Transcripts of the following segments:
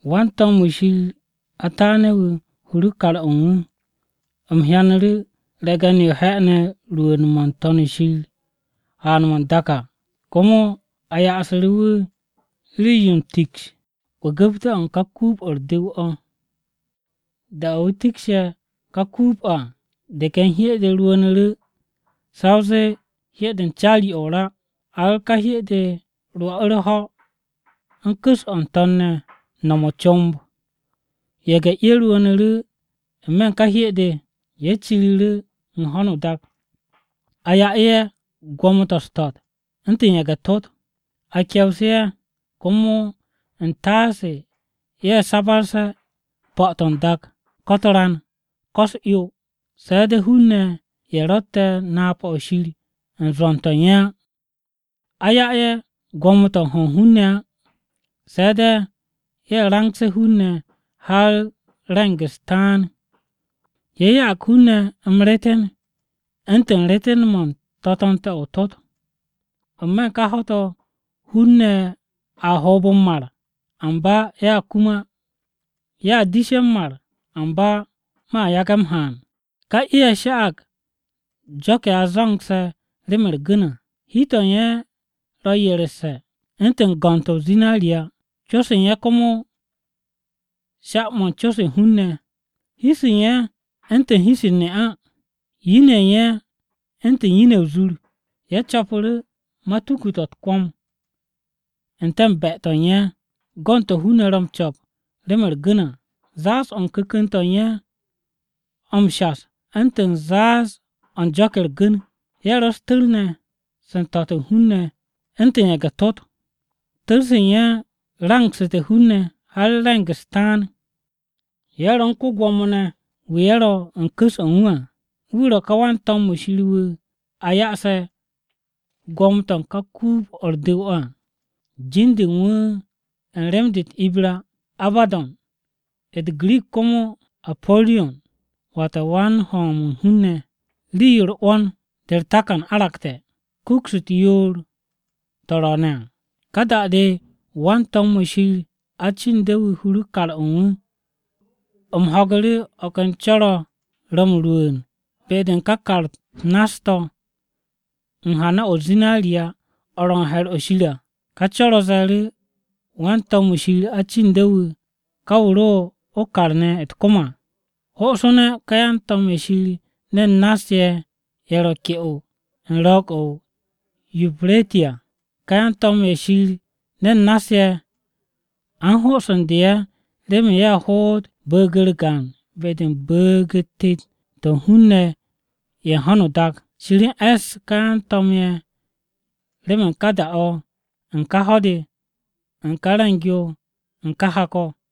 Wan-to̱m-wu̱ Shir ataane̱-wu̱ huru kar-o̱ u̱n wu̱. U̱m hyanu̱ru̱ re̱ge̱n-yo he'ene̱ rwu̱u̱n-mo̱ n-To̱n shir haan-mo̱ n-dak à, komo a ya'asu̱ru̱ wu̱ rii-yo u̱n tiks u̱n 'wu̱gu̱pte̱-o̱ u̱n ka kuub-o̱ u̱r-du̱w o̱. Da-o̱ wu̱ tikshe̱ ká kuub-o̱ à, de ken hye-de rwu̱u̱nu̱ru̱ sa o zee hye-de u̱n caari-o̱ o-ra, har ká hye-de rwo̱'u̱ u̱r-ho̱ u̱n ku̱s-o̱ n-to̱n ne̱ no̱m o-comb. Ye̱ge̱-'e rwu̱u̱nu̱ru̱ n-me̱ u̱n ká hye-de, ye̱ ciru̱ru̱ u̱n ho̱no o-dak, a ya'u̱ ye̱ gwo̱mo-to̱ u̱s-to̱t u̱ntu̱n ye̱ge̱-tot. A kewsu̱ ye̱ komo u̱n taase ye̱ sabarse̱ po̱-to̱ n-dak, ko̱ u̱t-ran, ko̱ u̱s-'yo, se̱ de̱ hun-ne̱ ye̱ ro̱tte̱ napa-o̱ Shir u̱n zwo̱n-to̱ u̱n ye̱ á. A 'ya ye̱ gwo̱mo-to̱ u̱n ho̱ u̱n ne̱t á, se̱ de̱ ye̱ rangse̱ hun-ne̱ har re̱ng-u̱s taan. Ye̱ ya'ag hun-ne̱ m-reeten u̱ntu̱n reeten-mo̱ u̱n to̱to̱nte̱-o̱ o-tot. N-me̱ u̱n ká ho̱-to̱ hun-ne̱ a hoob m-mar, amba ye̱a kum á. Ye̱a dishe̱ m-mar amba mo̱a yage̱ m-haan. Ká 'e-ye̱ sha'ag jo̱k-ye̱ a zo̱ngse̱ remen u̱r-gu̱n à. Hi-to̱ u̱n ye̱ ro̱ yeresse̱ u̱ntu̱n go̱nd-to̱ o-zinariya, co-se u̱n ye̱ komo sha-mo̱ u̱n co-se u̱n hun-ne̱. Hi-se u̱n ye̱ u̱ntu̱n hi-se u̱n ne'a, yin-ye̱ u̱n ye̱ u̱ntu̱n yin-ye̱ o-zur. Ye̱ co̱pu̱ru̱ matuku-to̱ u̱t-kwo̱m n-te̱ u̱n be-to̱ u̱n ye̱, go̱ u̱n to̱ hun-ne̱ ro̱ m-co̱p remen u̱r-gu̱n à, zááz-o̱ u̱n ku̱ku̱n-to̱ u̱n ye̱ m-shas u̱ntu̱n zááz-o̱ u̱n jo̱k-ye̱ u̱r-gu̱n. Ye̱ ro̱ u̱s-tu̱r ne̱, se u̱n to̱t u̱n hun-ne̱ u̱ntu̱n ye̱ge̱-tot. Tu̱r-se u̱n ye̱ rangsu̱te̱ hun-ne̱ har re̱ng-u̱s taan. Ye̱ ro̱ u̱n ko-Gwo̱mo ne̱, wu̱ ye̱ ro̱ u̱n ku̱s-o̱ u̱n wu̱ à, wu̱ ro̱ ká wan-to̱m-wu̱ Shir wu̱ a ya'ase̱ gwo̱mo-to̱ u̱n ká kuub-o̱ u̱r-du̱w o̱ à. Jin-de u̱n wu̱ u̱n rem-de u̱t-Ibra “Abaddo̱n” wu̱, u̱t-Girik komo, “Apo̱riyon” Wata “Wan-hom u̱n hun-ne̱.” Rii-yo u̱r-'wo̱n de u̱r-takan aragte̱, kuks u̱t-yoor to̱ ro̱o̱ne̱ à. Ka da-de wan-to̱m-wu̱ Shir acinde̱-wu̱ huru̱ kar-o̱ u̱n wu̱, u̱m ho̱gu̱ru̱ o̱ ken co̱r-o̱ ro̱ m-rwu̱u̱n be-de u̱n ka kar-u̱t nass-to̱ u̱n hana-o̱ u̱n zinariya o̱ ro̱ u̱n he̱r-o̱ Shir à. Ka co̱r-o̱ ze̱e̱ru̱ wan-to̱m-wu̱ Shir acinde̱-wu̱, ka wu̱ ro o-kar ne̱ u̱t-kom à, “Ho'osu̱ne̱ ka yan-to̱m ye̱ Shir ne̱n nass-ye̱ ye̱ ro̱ ke'o u̱n ro̱o̱g-o̱ o-Yupireti à!” Ka yan-to̱m-ye̱ Shir ne̱n nass-ye̱, a u̱n ho'osu̱ndu̱ ye̱ remen ye̱ hoot bu̱u̱g-u̱r gaan be-de u̱n bu̱u̱g-u̱t tet-to̱ u̱n hun-ne̱ ye̱ u̱n ho̱no o-dak. Shir e̱ss ka yan-to̱m ye̱ remen ká da-o̱ u̱n ká ho̱-de, u̱n ká re̱ng-yo u̱n ká hak-o̱ ne̱.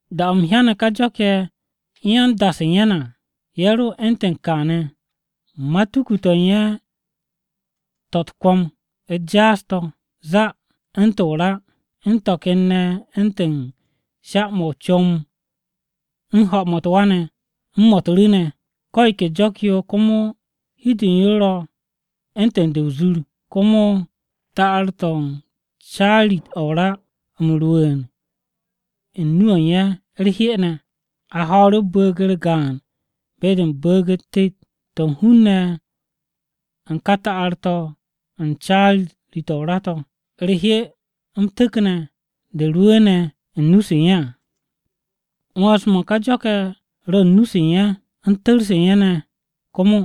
Da-o̱ u̱m hyane̱ ka jo̱k-ye̱ u̱n yan-da-se u̱n ye̱ ne̱ à, ye̱ ro u̱ntu̱n kaane̱: matuku-to̱ u̱n ye̱ to̱ u̱t-kwo̱m u̱t-jaas to̱ zàà u̱ntu̱n o-ra, u̱n to̱ ken ne̱ u̱ntu̱n sha-mo̱ o-comb u̱n ho̱-mo̱ u̱t-wa ne̱ u̱n mo̱ u̱t-ru̱ ne̱. Ko̱ yo ke jo̱k-yo komo hi-de u̱n yo ro̱ u̱ntu̱n de o-zur, komo ta'ar-to̱ u̱n caari-o̱ o-ra m-rwu̱u̱n u̱n nu-o̱ u̱n ye̱ u̱r-'hye ne̱. A ho̱o̱ru̱ bu̱u̱g-u̱r gaan be-de u̱n bu̱u̱g-u̱t tet-to̱ u̱n hun-ne̱ u̱n ká ta'ar-to̱ u̱n caari-o̱ o-ra to̱, u̱r-'hye m-tu̱kne̱ de rwu̱u̱ne̱ u̱n nu-se u̱n ye̱ à. 'Wo̱ns-mo̱ u̱n ka jo̱k-ye̱ ro̱ u̱n nu-se u̱n ye̱, u̱n tu̱r-se u̱n ye̱ ne̱ komo.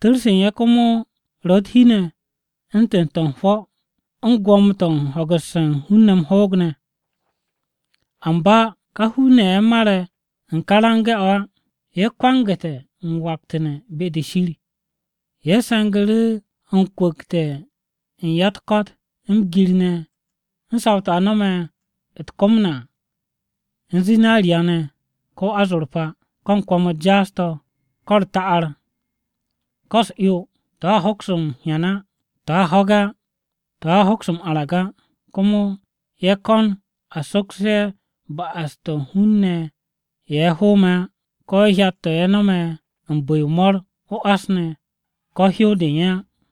Tu̱r-se u̱n ye̱ komo ro̱ u̱t-hi ne̱ u̱ntu̱n to̱ u̱n hwo̱ u̱n gwo̱mo-to̱ u̱n ho̱gu̱sse̱ u̱n hun-ne̱ m-hoog ne̱. Amba ka hun-ne̱ ye̱ mare̱ u̱n ka rangse̱-o̱ á, ye̱ kwangu̱te̱ m-waktu̱ne̱ be-de Shir. Ye̱ se̱ngu̱ru̱ u̱n kwu̱kte̱ u̱n ya-u̱t-ko̱t m-gir ne̱ u̱n saw-to̱ a no̱me̱ u̱t-kom à u̱n zinariya, ko̱ azorpa à, ko̱ u̱n kwo̱m-u̱t jaas-to̱, ko̱ u̱r-ta'ar, ko̱ u̱s-'yo, to̱a hoks m-hyan á, to̱a ho̱ge̱ á, to̱a hoks m-arag á. Komo ye̱ ko̱n a soksu̱ ye̱ ba'as-to̱ u̱n hun-ne̱ ye̱ ye̱ hoome̱ á, ko̱ hyat-to̱ ye̱ nome̱ u̱n bu̱-yo u̱n mo̱r, o-ás, ko̱ hyow-de u̱n ye̱ á.